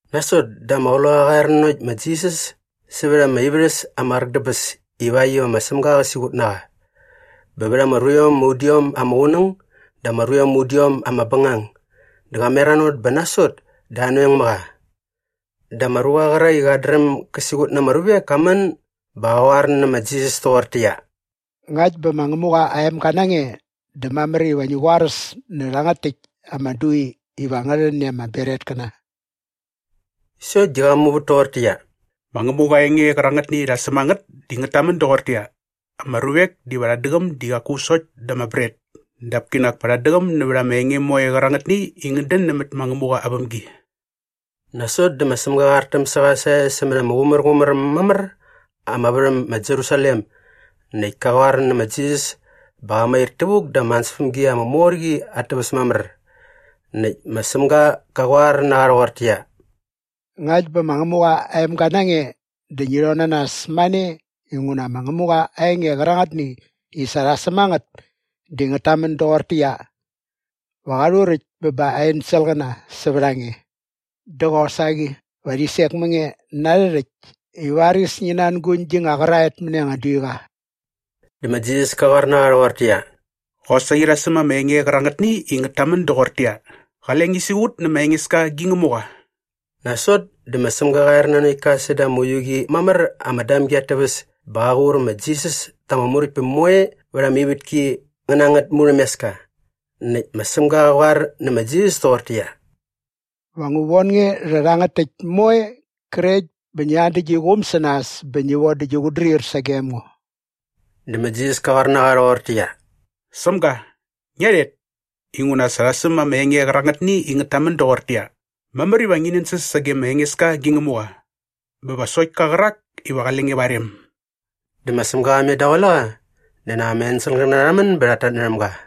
Nasot dä ama Qloqaqa qa er nanokt ma Jisas sävät ama ivärhäs ama qräk dä bäs ivakt iva ma Sämga qä siqut na qa. Bä vät ama ruiom ama udiom ama qunäng dä ama ruiom ama udiom ama bängang dä qa meranot bä nasot dä anoeng mä qa. Dä ama ruqa qärak i qat dräm gä siqut na ama ruvek ka män bä qa qoar nä ma Jisas toqortäqyia, “Ngakt bä ma Ngämuqa aa emga na nge dä mamär iva ngi qoaräs nä rhärhangät täkt ama dui iva ngä rhän i ama bretkäna.” Sokt di qa muvät toqortäqyia, “Ma Ngämuqa aa enge qärangätni i sa rha säm a ngät di ngät tamän doqortäqyia, “‘Ama ruvek diva rhat däqäm di qaku sokt da ama bret dap kinak pa rhat däqäm nävät ama enge moe qärangätni i ngät dän nämät ma Ngämuqa aa vämgi.’” Nasot dä ma Sämga qa artäm sä qa sae sämät ama qumärqumär äm mamär ama värhäm ma Jerusalem näkt ka qoar nä ma Jisas bä qa mair tävuk da ama ansäspämgi ama mor qi at täväs mamär. Näkt ma Sämga qa qoar na qa rhoqortäqyia, “Ngakt bä ma Ngämuqa aa emga na nge dä ngi rhon na nas mane inguna ma Ngämuqa aa enge qärangätni i sa rha säm a ngät di ngät tamän doqortäqyia, “‘Va qa rhuräkt bä ba aa enselqäna sävät a nge’ dä qosaqi “‘Va rhi sek mä nge na arhä rhäkt i varis ngi nanguñ gi nga qäraet mäni anga duiqa.’” Dä ma Jisas ka qoar na qa rhoqortäqyia, “Qosaqi rha säm ama enge qärangätni i ngät tamän doqortäqyia, ‘Qale ngi siqut nä ma Engeska gi Ngämuqa.’” Nasot dä ma Sämga qa er nanokt ka säda ama uiu qi mamär ama damgi at täväs bä qa qur ma Jisas ta ama muräktpäm moe vät ama ivätki ngä na angät murhämeska. Näkt ma Sämga qa qoar nä ma Jisas toqortäqyia, “Va ngu von nge rha rhärhangät täkt moe qrekt bä ngi an dä gi quum sä nas bä ngi von dä gi qutdrir sagem ngo.” Dä ma Jisas ka qoar na qa rhoqortäqyia, “Sämga, ngia rhet! Inguna sa rha säm ama enge qärangätni i ngät tamän doqortäqyia, “‘Mamär iva ngi nänsäs sage ma Engeska gi Ngämuqa bä va sokt ka qärak iva qale nge va aa rem.’” Dä ma Sämga qa met daqule qa dä nak ama enselqäna rha män bä rhat tatnärhäm ga.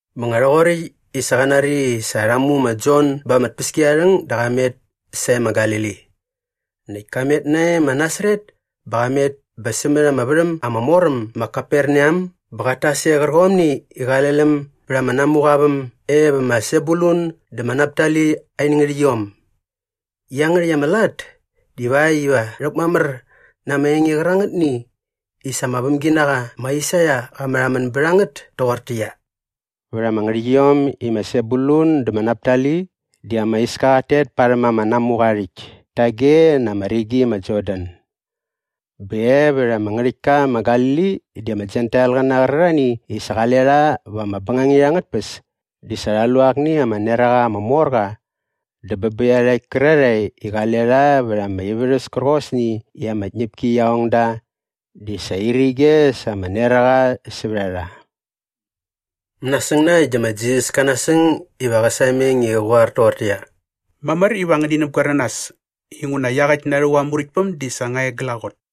Bä nga rhoqoräkt i sa qa nari i sa rha mu ma Jon ba ama tpäskiarharhäng dä qa met sae ma Galili. Näkt ka met nae ma Nasaret bä qa met bä sämät ama värhäm ama mor äm ma Kaperneam bä qat tas e qärqomni i qale läm bät ama namuqa aa väm e va ma Sebulun dä ma Naptali in ngärhäqyiom. Iangärhäkt ama lat divakt iva rhäkmamär na ama enge qärangätni i sa ama vämginaqa ma Aisaia qa märhamän bät a ngät toqortäqyia, “Vät ama ngärhäqyiom i ma Sebulun dä ma Naptali di ama iska qat tet parhäm ama namuqa aa rhäkt tage na ama rigi ma Jordan. Bä e vät ama ngärhäktka ma Galili di ama Jentailqäna qärarhani i sa qale rha va ama bängangit angät tpäs di sa rha lu akni ama neraqa ama mor qa dä bä bä iarhakt kärarhae i qale rha vät ama ivärhäs kärqosni i ama tñäpki qia ong da di sa irige sa ama neraqa sävät a rha.” Mänasäng na äkt dä ma Jisas ka nasäng iva qä sameng i qä qoar toqortäqyia, “Mamär iva ngäni näpgoer na nas inguna iaqäkt na rhävuk aa Muräktpäm di sa nga e glaqot.”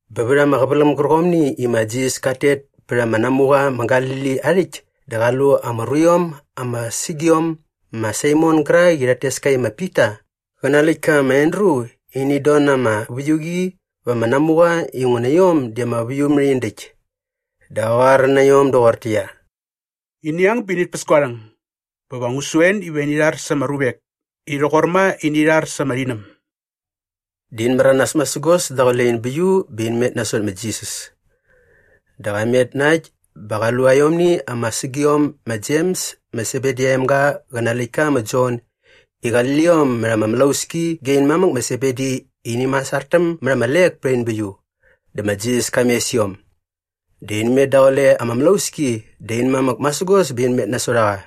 Bä vät ama qäväläm gärqomni i ma Jisas kat tet pät ama namuqa ma Galili aa rhäkt dä qa lu ama ruiom ama sägiom ma Saimon gärak i rhat tes ka i ma Pita qä nä aa läktka ma Andru i init don na ama väiuqi va ama namuqa inguna iom di ama väiumärhindäkt. Dä qa qoar na iom doqortäqyia, “Ini ang bä init päs gua rhäng bä va ngu su en iva ini rhar sa ama ruvek i rhoqor ma i ini rhar sa ama rhinäm.” Dä in märanas masägos daqule in bäiu bä in met nasot ma Jisas. Dä qa met na äkt bä qa lu aiomni ama sägiom ma Jems ma Sebedi aa emga qä na aa läktka ma Jon i qali liom mät ama mlauski ge in mamäk ma Sebedi i ini masartäm mät ama lek pät in bäiu. Dä ma Jisas ka mes iom. Dä in met daqule ama mlauski dä in mamäk masägos bä in met nasot a qa.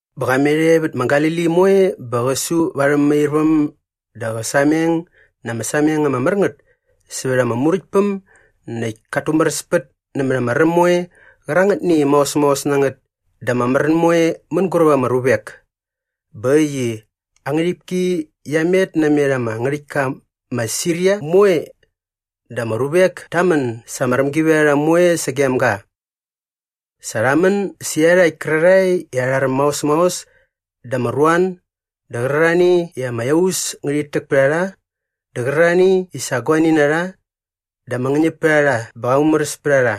Bä qa met e vät ma Galili moe bä qä su va arhä mämairväm dä qä sameng na ama sameng ama mär ngät sävät ama Muräktpäm näkt kat tumäräspät nämät ama räm moe qärangätni i maos maos na ngät dä ama märän moe mänguräp ama ruvek. Bä äkt i aa ngärhipki qia met namet ama ngärhäktka ma Siria moe dä ama ruvek ta män sa ama rämgivärharha moe sagem ga. Sa rha män sä iarhakt kärarhae i arha räm maos maos dä ama ruan dä qärarhani i ama iaus ngärhit täk pät a rha dä qärarhani i sa guani na rha dä ama ngäñäpärharha bä qa mumäräs pät a rha.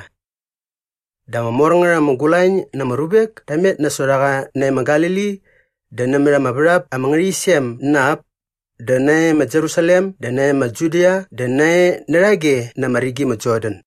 Dä ama mor ngät ama gulañ na ama ruvek ta met nasot a qa nae ma Galili dä nämät ama värhap ama ngärhäqyisem na ap dä nae ma Jerusalem dä nae ma Judia dä nae närhage na ama rigi ma Jordan.